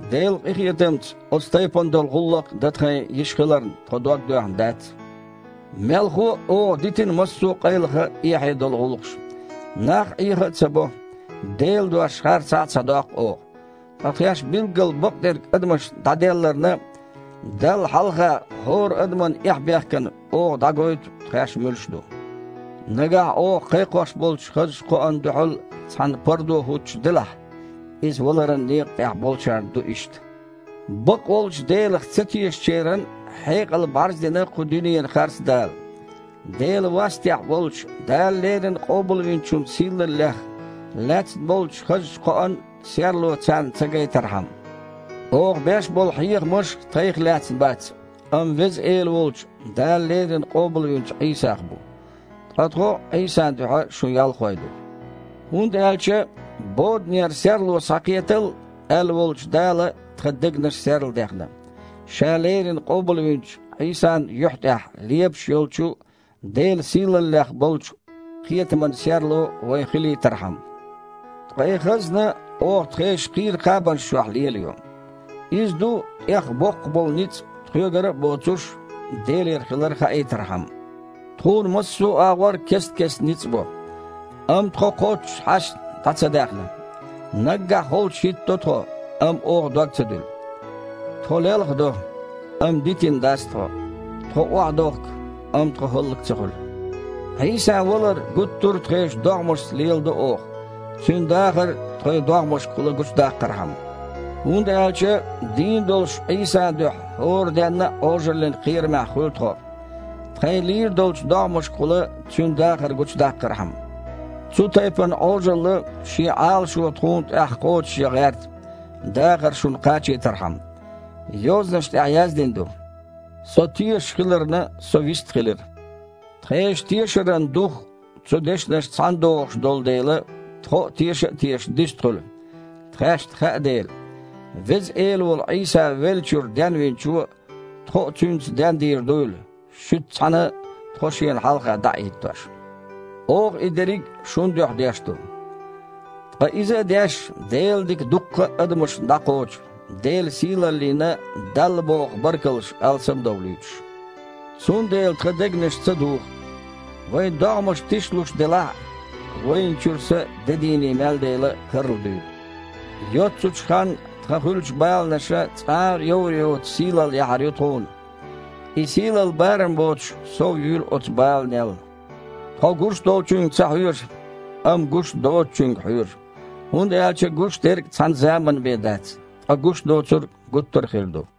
Делан къинхетамца оцу тайпана долу гІуллакх дан тхайн йиш хиларна, тхо дог доьхна дац. Мелхо а, оха дитина массо а къайлаха а, эхье а долу гІуллакхаш. Нах Іеха а ца бо, Делан дош харцахьа а ца доккху оха. Ткъа тхаьш билггал бакъдерг адамашна дІаделларна, Далла хьалха хІора адаман эхь-бехкана оха дІагойту тхаьш муьлш ду. Нагахь оха кхайкхош болчу хазачу кхоана дуьхьал цхьанна пардо хІуттуш делахь, иза валаран некъа тІехь болчарна ду иштта. Бакъволчу Делах ца тешачеран хьекъал бІарздина кху дуьненан харцдала, Делан вастехь волчу Дала леррина Къобалвинчун сийлаллех лаьцна болчу хазачу кхоан серло царна ца гайтархьама. Оха беш болу хьехамаш тхайх лаьцна бац, амма Веза Эла волчу, Дала леррина къобалвинчу Іийсах бу. Ткъа тхо Іийсан дуьхьа шун ялхой ду. ХІунда аьлча: «Боданера серло схьакхетал!» – аьлла волчу Дала тхан дегнаш серладаьхна, Ша леррина къобалвинчу Іийсан юьхь тІехь лепаш йолчу Делан сийлаллех болчу кхетаман серло вайн хилийтархьама. Ткъа и хазна оха тхешан кхийра кхабанаш чохь лелайо. Иза ду тІех боккха болу ницкъ, тхоьгара а боцуш, Делера хилар хаийтархьама. Тхуна массо а агІор кест-кеста ницкъ бо, амма тхо кхоччуш хьаьшна дІа ца даьхна. Наггахь холчу хІиттадо тхо, амма оха дог ца дуьллу. Тхо лелхадо, амма дитина дац тхо. Тхо охьадохку, амма тхо хІаллак ца хуьлу. Іийсан валар гуттара а тхешан догІмашца леладо оха, Цуьнан дахар тхайн догІмашкахула гучудаккхархьама. ХІунда аьлча дийна долуш Іийсан дуьхьа хІора денна а Іожаллин кхерамехь хуьлу тхо, тхайн лийр долчу догІмашкахула Цуьнан дахар гучудаккхархьама. Цу тайпана Іожалла шен Іалашо тхуна тІехь кхочушъян гІерта, дахар шуна кхачийтархьама. Йозанаш тІехь яздина ду: «Со тешаш хиларна, со вистхилира». Тхешан тешаран дух цу дешнашца цхьаьнадогІуш долу дела, тхо а, теша а тешаш, дистхуьлу, тхаьшна хаьа дела, Веза Эла волу Іийса веллачуьра Денвинчо тхо а Цуьнца дендийр дуйла, шуьца цхьаьна тхо Шена хьалха дІа а хІиттош. Оха и дерриг а шун дуьхьа деш ду. Ткъа иза а деш, Делан дика дуккха а адамашна дІакхочу, Делан сийлаллина Далла боху баркаллаш алсам а довлуьйтуш. Цундела тхан дегнаш ца духу. Вайн догІмаш тишлуш делахь а, вайна чуьра са де дийне мел дели а карладуьйлу. Йоццачу ханна тхан хуьлучу баланаша, цкъа а йовр йоцу сийлалла яхьар ю тхуна. И сийлалла барам боцуш совъюьйлу оцу баланел. Тхо гуш долчуьнга ца хьоьжу, амма гуш доцучуьнга хьоьжу. ХІунда аьлча гуш дерг цхьана заманна бен дац, ткъа гуш доцург гуттара а хир ду.